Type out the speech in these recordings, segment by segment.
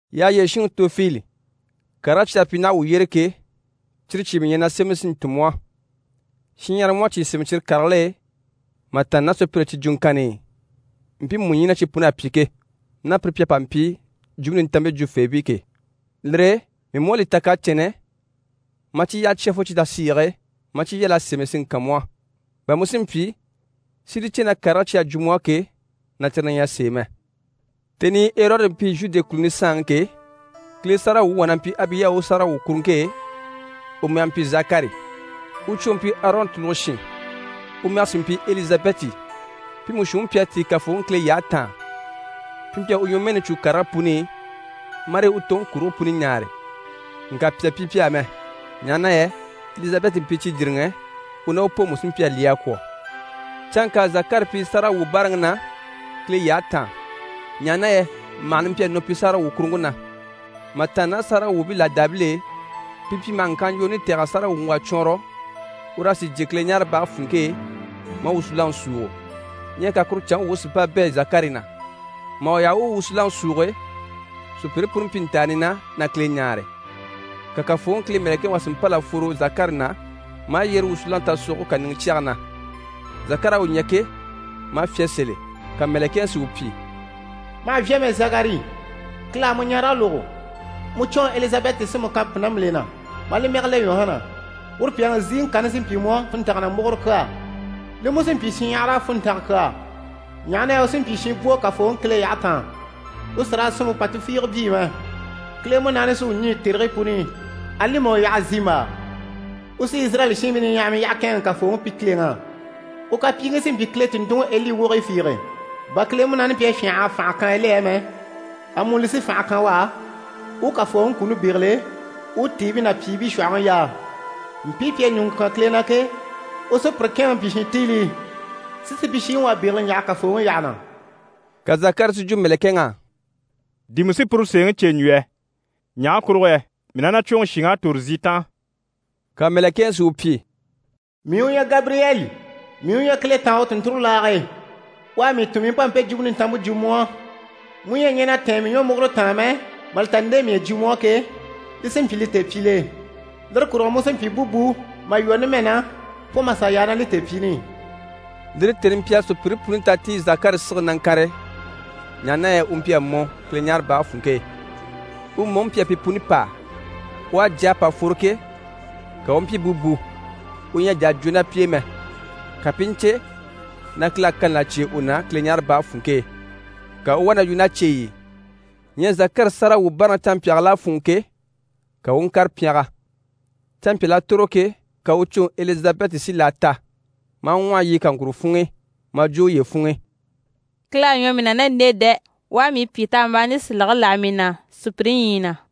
Yyaha yyére shinŋi Tofili, karigii cyi à pyi naha wuu yyére ke, cyire cyìi mii ɲyɛ na sémɛni si ntun mu á. Shinɲyahara mú à cyìi sémɛ cyire karigil'e, mà tàanna ná sùpyire cyi jwuŋkanni i, mpiimu ɲyii na cyi pun'à pyi ke, ná pire pi à pa mpyi Jwumpe Nintanmpe jwufeebii ke. Lire e mii mú à li ta kacɛnnɛ maa cyi yyaha cya fo cyi tasiige e maa cyi yal'a sémɛ si ŋkan mu á, bà mu si mpyi si li cè na karigii cyi à jwo mu á ke, na cyire na ɲyɛ sèe mɛ. Tèni i Erɔdi mpyi Zhude kùluni saanŋi ke, Kile sáragawwuŋi wà na mpyi Abiya u sáragawwukuruŋke e, u mɛge mpyi Zakari. U cwoŋi mpyi Arɔn tùluge shin, u mɛge sí mpyi Elizabɛti. Pi mú shuunniŋi mpyi a tíi Kafooŋi Kile yyahe taan, pi mpyi a u ɲwɔmɛɛni cû karigii puni i, marii u toŋi kurigii puni ɲaare. Ŋka pyà mpyi pi á mɛ, ɲaha na yɛ Elizabɛti mpyi cijiriŋɛ. U ná u pooŋi mú sí mpyi a lyɛ a kwɔ̀. Canŋka Zakari mpyi sáragawwubaaraŋi na Kile yyahe taan, ɲaha na yɛ màhani mpyi a nɔ pi sáragawwukuruŋke na. Mà tàanna ná sáragawwuubii làdaabil'e, pi mpyi maha ŋkyaanlwooni tɛ̀g'a sáragawwuŋi wà cwɔɔnrɔ, ur'a sì jyè Kileɲaarebage funŋke e maa wusunaŋi súugo. Ɲyɛ ka kuru canŋke wuŋi si mpa bɛ̂ Zakari na. Mà u yaha u u wusunaŋi súuge, sùpyire puni mpyi ntàani na na Kile ɲáare. Ka Kafooŋi Kile mɛ̀lɛkɛŋi wà si mpâl'a fworo Zakari na, maa yyére wusunaŋi tasogoge kàniŋɛ cyage na. Zakari à u ɲya ke, maa fyá sèl'e. Ka mɛ̀lɛkɛŋi si u pyi: «Ma hà vyá mɛ Zakari, Kile à mu ɲarege lógo. Mu cwoŋi Elizabɛti sí mu kan pùnambile na, maa li mɛge le Yuhana. Uru pyàŋi ziŋi kani sí n‑pyi mu á funntanga ná múguro kyaa. Li mú sí n‑pyi shinɲyahara á funntanga kyaa, ɲaha na yɛ u sí n‑pyi shinbwo Kafooŋi Kile yyahe taan. U sì raa sinmpe pà tufiige byii mɛ. Kile Munaani sí u ɲî tèrigii puni i, ali mà u yaha zimbaa. U sí Izirayɛli shiinbii niɲyahamii yyaha kɛ̂ɛnŋɛ Kafooŋi pi Kileŋi á. U kapyiiŋkii sí n‑pyi Kile tùnntunŋiEli wogigii fiige. Bà Kile Munaani mpyi a fyânha a fànhe kan Eli á mɛ, amuni li sí fànhe kan u á, u u Kafooŋi kuni bégele, u u tiibii ná pyìibii shwɔ̀hɔŋi yaa. Mpii pi à ɲùŋɔ kyán Kile na ke, u sí pire kɛ̂ɛnŋɛ n‑pyi shintiilii, si supyishiŋi wà bégele ɲjaha Kafooŋi yyaha na.» Ka Zakari si jwo mɛ̀lɛkɛŋ'á: «Di mii sí puru sèeŋi cè n‑jwo yɛ? Ɲaha kurugo yɛ mii ná na cwoŋi shìŋ'à tòro zi taan.» Ka mɛ̀lɛkɛŋi si u pyi: «Mii u ɲyɛ Gabiriyɛli. Mii u ɲyɛ Kile taan u tùnnture laage e. U à mii tun mii u pa mpe jwumpe nintanmpe jwo mu á. Mu ɲyɛ a ɲɛn'a tɛ̀ɛn mii ɲwɔmugure taan mɛ, mà li ta nde mii à jwo mu á ke, li sí n‑pyi li tèepyil'e. Lire kurugo mu sí n‑pyi búbu, mà lwɔ́ numɛ na fo mà sà yaa ná li tèepyiini i.» Lire tèni mpyi a sùpyire puni ta ti i Zakari sigili na ŋkànre, ɲaha na yɛ u mpyi a mɔ Kileɲaarebage funŋke e. U mɔŋi mpyi a pi puni pâa. U à jà a pa fworo ke, ka u u mpyi búbu, u ɲyɛ a jà a jwo ná pi e mɛ, ka pi i ɲcè na Kile à kani là cyêe u na Kileɲaarebage funŋke e. Ka u u wá na yu ná cyeyi i. Ɲyɛ Zakari sáragawwubaaraŋi canmpyaagil'à fûnŋɔ ke, ka u u ŋkàre pyɛngɛ. Canmpyal'à tòro ke, ka u cwoŋi Elizabɛti si laa ta, maa ŋwɔhɔ yiɲyɛ kaŋkuro funŋ'i. Maa jwo uye funŋ'i: «Kile à ɲwɔ mii na ná nde e dɛ! U à mii pyìtambaani silege láha mii na sùpyire ɲyii na.»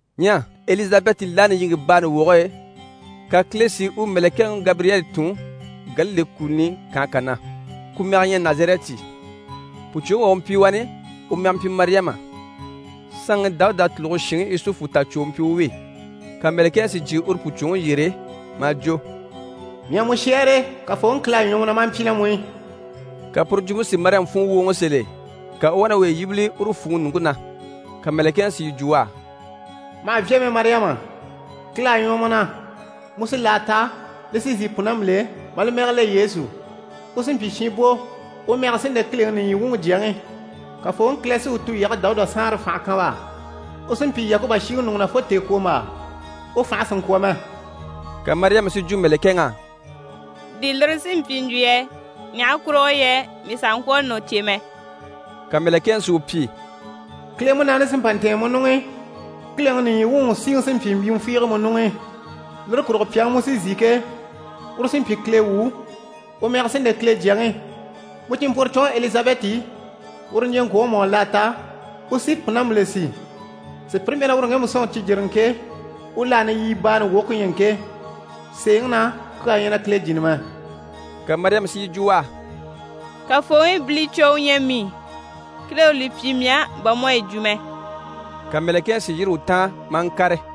Ɲyɛ Elizabɛti laani yiŋke baani woge e, ka Kile si u mɛ̀lɛkɛŋi Gabiriyɛli tun Galile kùluni kànhe kà na, ku mɛge ɲyɛ Nazarɛti. Pùcwoŋi wà u mpyi wani, u mɛge mpyi Mariyama. Saanŋi Dawuda tùluge shinŋi Yusufu tàcwo u mpyi u wi. Ka mɛ̀lɛkɛŋi si jyè uru pùcwoŋi yyére, maa jwo: «Mii à mu shɛ́ɛre, Kafooŋi Kile à ɲwɔ mu na maa mpyi ná mu i.» Ka puru jwumpe si Mariyama funŋɔ wwòoŋɔ sèl'e, ka u u wá na uye yíbili uru fwùŋi ɲùŋke na. Ka mɛ̀lɛkɛŋi si yi jwo u á: «Ma hà vyá mɛ Mariyama, Kile à ɲwɔ mu na. Mu sí laa ta, li sí n‑si pùnambile, maa li mɛge le Yesu. U sí n‑pyi shinbwo, u mɛge sí n‑le Kileŋi nìɲyi wuŋi Jyaŋi. Kafooŋi Kile sí u tulyage Dawuda saanre fànhe kan u á. U sí n‑pyi Yakuba shiŋi ɲùŋɔ na fo tèekwombaa. U fànhe sì n‑kwɔ̀ mɛ.» Ka Mariyama si yi jwo mɛ̀lɛkɛŋ'á: «Di lire sí n‑pyi n‑jwo yɛ? Ɲaha kurugo yɛ mii sàha ŋkwɔ̀ a nɔ̀ cè mɛ.» Ka mɛ̀lɛkɛŋi si u pyi: «Kile Munaani sí n‑pa n‑tɛ̀ɛn mu ɲuŋ'i. Kileŋi nìɲyi wuŋi u síŋi sí n‑pyi mbyìmɛ fiige mu ɲuŋ'i. Lire kurugo pyàŋi mu sí n‑si ke, uru sí n‑pyi Kile wu, u mɛge sí n‑le Kile Jyaŋi. Mu cìnmpworocwoŋi Elizabɛti, uru niɲjyeŋkwoŋi mú à laa ta, u sí pùnambile si. Sùpyire mpyi na uru ŋgemu sɔ̂nŋi cijiriŋɛ ke, u laani yibaani woge ku ɲyɛ ŋke. Sèeŋi na, kyaa ɲyɛ na Kile jìni mɛ.» Ka Mariyama si yi jwo u á: «Kafooŋi bilicwo u ɲyɛ mii, Kile u li pyi mii á bà mu à yi jwo mɛ.» Ka mɛ̀lɛkɛŋi si yîri u taan maa ŋkàre.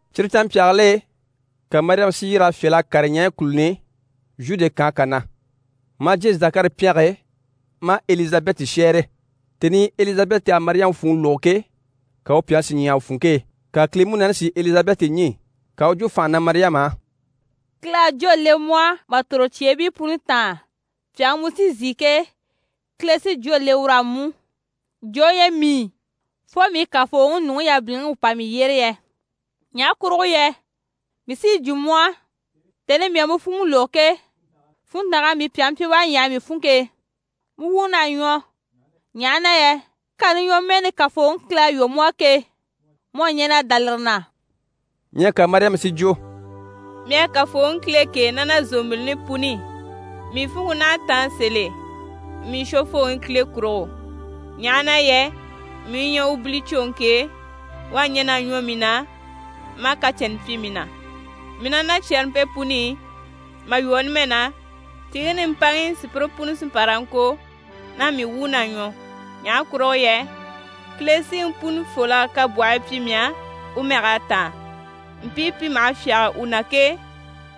Cyire canmpyaagil'e, ka Mariyama si yîr'a fyâl'a kàre ɲaɲyi kùluni i, Zhude kànhe kà na. Maa jyè Zakari pyɛnge e, maa Elizabɛti shɛ́ɛre. Tèni i Elizabɛti à Mariyama fwùŋi lógo ke, ka u pyàŋi si ɲyàha u funŋke e. Ka Kile Munaani si Elizabɛti ɲî, ka u u jwo fànha na Mariyama á: «Kile à jwó le mu á mà tòro cyeebii puni taan! Pyàŋi mu sí n‑si ke, Kile sí jwó le ur'á mú! Jo u ɲyɛ mii, fo mii Kafooŋi nuŋi yabiliŋi u pa mii yyére yɛ? Ɲaha kurugo yɛ mii sí yi jwo mu á, tèni i mii à mu fwùŋi lógo ke, funntang'à mii pyàŋi pyi u à ɲyàha mii funŋke e. Mu wuun'à ɲwɔ, ɲaha na yɛ kani ɲwɔmɛɛni Kafooŋi Kile à lwɔ́ mu á ke, mu à ɲɛn'a dá lire na.» Ɲyɛ ka Mariyama si jwo: «Mii à Kafooŋi Kile kêe ná na zòmbilini puni i, mii funŋke naha a táan sèl'e mii Shwofooŋi Kile kurugo. Ɲaha na yɛ mii u ɲyɛ u bilicwoŋi ke, u à ɲɛn'a ɲwɔ mii na, maa kacɛnnɛ pyi mii na, mii ná na cyɛrɛmpe puni i. Mà lwɔ́ numɛ na, tìiŋi nimpaŋi sùpyire puni sí n‑pa raa ŋko na mii wuun'à ɲwɔ. Ɲaha kurugo yɛ Kile Siŋi Punifol'à kabwɔhii pyi mii á, u mɛg'à táan. Mpii pi maha fyáge u na ke,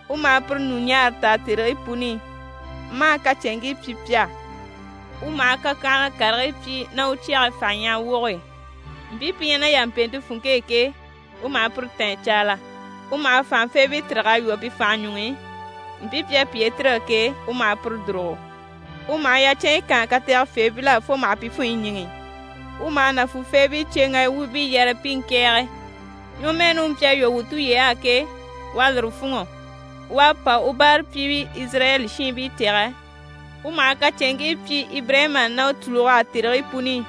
u maha pire ɲùɲaara taa tèrigii puni i, maa kacɛnŋkii pyi pi á. U maha kakyanhala karigii pyi ná u cyɛge fànha ɲyahaga woge e. Mpii pi ɲyɛ ná yàmpeente funŋke e ke, u maha pire tîn a caala. U maha fànhafeebii tîrig'a lwɔ́ pi fànhe ɲuŋ'i, mpii pi à piye tîrige ke, u maha pire dùrugo. U maha yacɛnɲyi kaan kategefeebil'á fo maha pi funɲyi ɲíŋɛ. U maha nàfuufeebii cyeŋgaya wuubii yare pi i ŋkɛ̀ɛge. Ɲwɔmɛɛni u mpyi a lwɔ́ wuu tulyey'á ke, u à lire fûnŋɔ. U à pa u báarapyiibii Izirayɛli shiinbii tɛ̀gɛ U maha kacɛnŋkii pyi Ibirayima ná u tùlug'á tèrigii puni i.»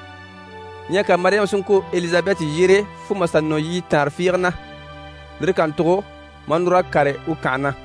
Ɲyɛ ka Mariyama si ŋkwôro Elizabɛti yyére fo mà nɔ yiɲyɛ taanre fiige na, lire kàntugo maa núr'a kàre u kànhe na.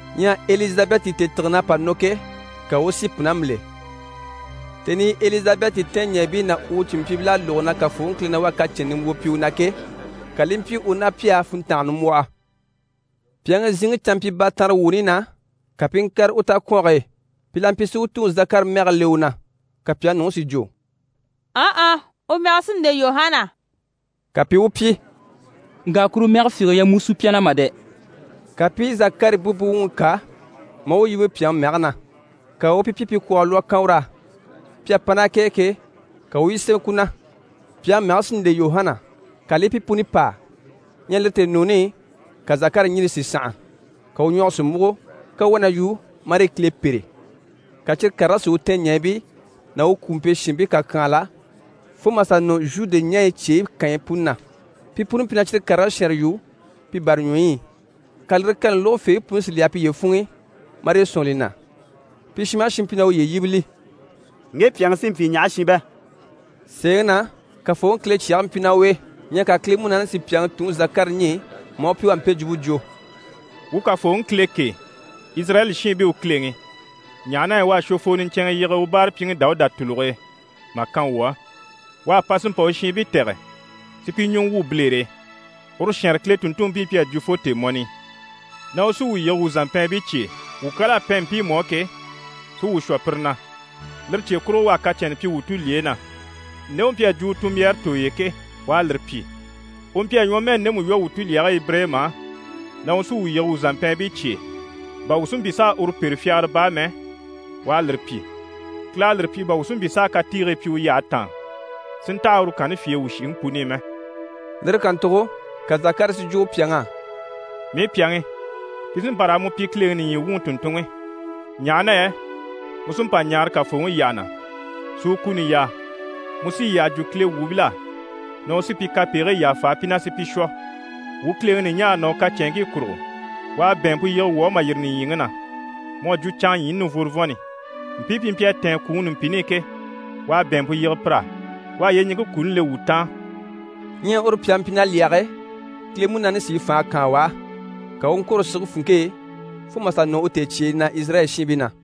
Ɲyɛ Elizabɛti tèetigen'à pa nɔ ke, ka u u si pùnambile. Tèni i Elizabɛti tɛɛnɲɛɛbii ná u cìnmpyiibil'à lógo na Kafooŋi Kile na wá à kacɛnnɛ nimbwoo pyi u na ke, ka li i mpyi u ná pi á funntanga nimbwɔhɔ. Pyàŋi ziŋi canmpyibaatanrewuuni na, ka pi i ŋkàre u takwɔnge e. Pi la mpyi si u tuŋi Zakari mɛge le u na, ka pyàŋi nuŋi si jwo: «Ɔnhɔ, u mɛge sí n‑le Yuhana.» Ka pi i u pyi: «Ŋka kuru mɛge fiige ɲyɛ mu sùpya na mà dɛ!» Ka pi i Zakari búbu wuŋi kà, maa u yíbe pyàŋi mɛge na. Ka u u pi pyi pi kwɔɔgɔ lwɔ́ a kan ur'á. Pi à pa ná k'e ke, ka u u yi sémɛ ku na: «Pyàŋi mɛge sí n‑le Yuhana» ka li i pi puni pâa. Ɲyɛ lire tèenuuni i, ka Zakari ɲjini si sànha, ka u ɲwɔge si múgo, ka u u wá na yu marii Kile pêre. Ka cyire karigii si u tɛɛnɲɛɛbii ná u kwùumpe shiinbii kàkyanhala, fo mà sà nɔ Zhude ɲaɲyi cyeyi kànyi puni na. Pi puni mpyi na cyire karigii shɛɛnre yu pi bàraɲwɔyi i. Ka lire kani lógofeebii puni si li yaha piye funŋ'i, marii sɔ̂nŋi li na. Pi shin maha shin mpyi na uye yíbili: «Ŋge pyàŋi sí n‑pyi ɲaha shi bɛ?» Sèeŋi na, Kafooŋi Kile cyɛge mpyi ná u e. Ɲyɛ ka Kile Munaani si pyàŋi tuŋi Zakari ɲî, maa u pyi u à mpe jwumpe jwo: «Wuu Kafooŋi Kile kêe, Izirayɛli shiinbii u Kileŋi, ɲaha na yɛ u à Shwofoo niɲcɛnŋɛ yige u báarapyiŋi Dawuda tùluge e mà kan wuu á. U à pa si mpa u shiinbii tɛ̀gɛ si pi ɲùŋɔ wwû bilere e. Uru shɛɛnre Kile tùnntunmpii mpyi a jwo fo tèemɔni i na u sí wuu yige wuu zàmpɛɛnbii cye e, wuu kyal'à pɛn mpiimu á ke, si wuu shwɔ pire na. Lire cye kurugo, u à kacɛnnɛ pyi wuu tulyeyi na. Nde u mpyi a jwo u tunmbyaare tooy'e ke, u à lire pyi. U mpyi a ɲwɔmɛɛni ndemu lwɔ́ wuu tulyage Ibirayima á, na u sí wuu yige wuu zàmpɛɛnbii cye e, bà wuu si mpyi s'a uru pêre fyagara baa mɛ, u à lire pyi. Kile à lire pyi bà wuu si mpyi s'a katiigii pyi u yyahe taan, si ntaha uru kanni fye e wuu shìŋi puni i mɛ.» Lire kàntugo ka Zakari si jwo u pyàŋ'á: «Mii pyàŋi, pi sí n‑pa raa mu pyi Kileŋi nìɲyi wuŋi tùnntunŋi, ɲaha na yɛ mu sí n‑pa ɲaara Kafooŋi yyaha na, si u kuni yaa. Mu sí yi yyaha jwo Kile wuubil'á na u sí pi kapegigii yàfa pi na, si pi shwɔ. Wuu Kileŋi ɲùɲaare ná u kacɛnŋkii kurugo, u à bɛ̀ɛnmpe yige wuu á mà yîri nìɲyiŋi na, mu à jwo canŋa ɲyiini nivworovɔnni. Mpii pi mpyi a tɛ̀ɛn kwùŋi numpini i ke, u à bɛ̀ɛnmpe yige pir'á. U à yyeɲiŋke kuni le wuu taan.» Ɲyɛ uru pyàŋi mpyi na lyɛge, Kile Munaani sí i fànhe kaan u á. Ka u u ŋkwôro sige funŋke e fo mà sà nɔ u tèecyeeni na Izirayɛli shiinbii na.